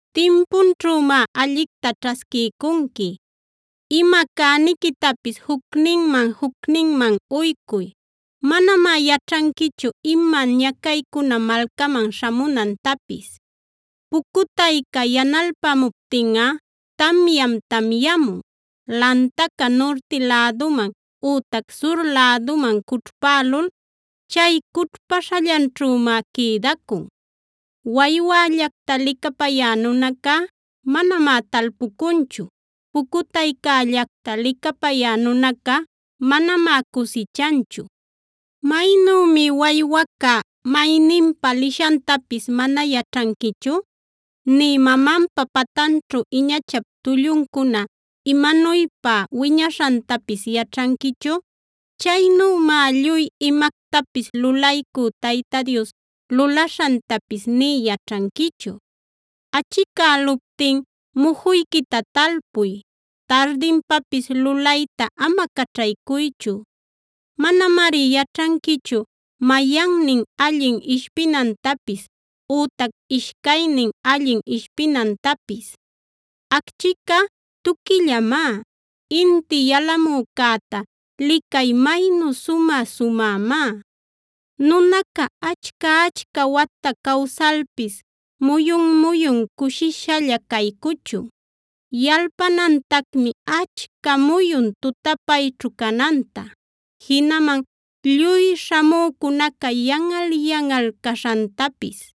timpunćhümá allicta ćhasquiycunqui. Ima cäniquitapis jucninman-jucninman uycuy; manamá yaćhanquichu ima ñacaycuna malcaman śhamunantapis. Pucutayca yanalpamuptinꞌa tamyam tamyamun. Lantaca nurti läduman ütac sur läduman cućhpälul, chay cućhpaśhallanćhümá quïdacun. Waywällacta licapayä nunaca manamá talpucunchu; pucutaycällacta licapayä nunaca manamá cusichanchu. Maynümi waywaca mayninpa lishantapis mana yaćhanquichub nï mamanpa patanćhu iñachap tulluncuna imanuypa wiñaśhantapisc yaćhanquichu, chaynümá lluy imactapis lulaycü Tayta Dios lulaśhantapis nï yaćhanquichu. Achicäluptin mujuyquita talpuy; tardinpapis lulayta ama caćhaycuychu. Manamari yaćhanquichu mayannin allin ishpinantapis; ütac ishcaynin allin ishpinantapis. Achquica tuquillamá; inti yalamücäta licay maynu sumä-sumämá. Nunaca achca-achca wata cawsalpis muyun-muyun cushishalla caycuchun; yalpanantacmi achca muyun tutapayćhu cananta. Jinaman lluy śhamücunaca yanꞌal-yanꞌal caśhantapis.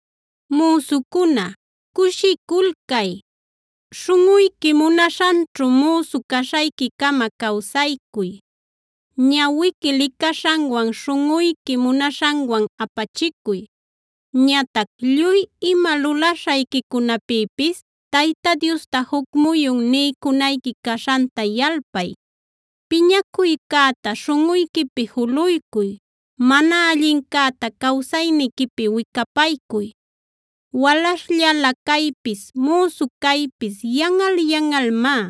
Müsucuna, ¡cushiculcay! Śhunꞌuyqui munaśhanćhu müsu caśhayquicama cawsaycuy. Ñawiqui licaśhanwan, śhunꞌuyqui munaśhanwan apachicuy. Ñatac lluy ima lulaśhayquicunapïpis Tayta Diosta juc muyun niycunayqui caśhanta yalpay. Piñacuycäta śhunꞌuyquipi juluycuy; mana allincäta cawsayniquipi wicapaycuy. Walaśhllala caypis, müsu caypis yanꞌal-yanꞌalmá.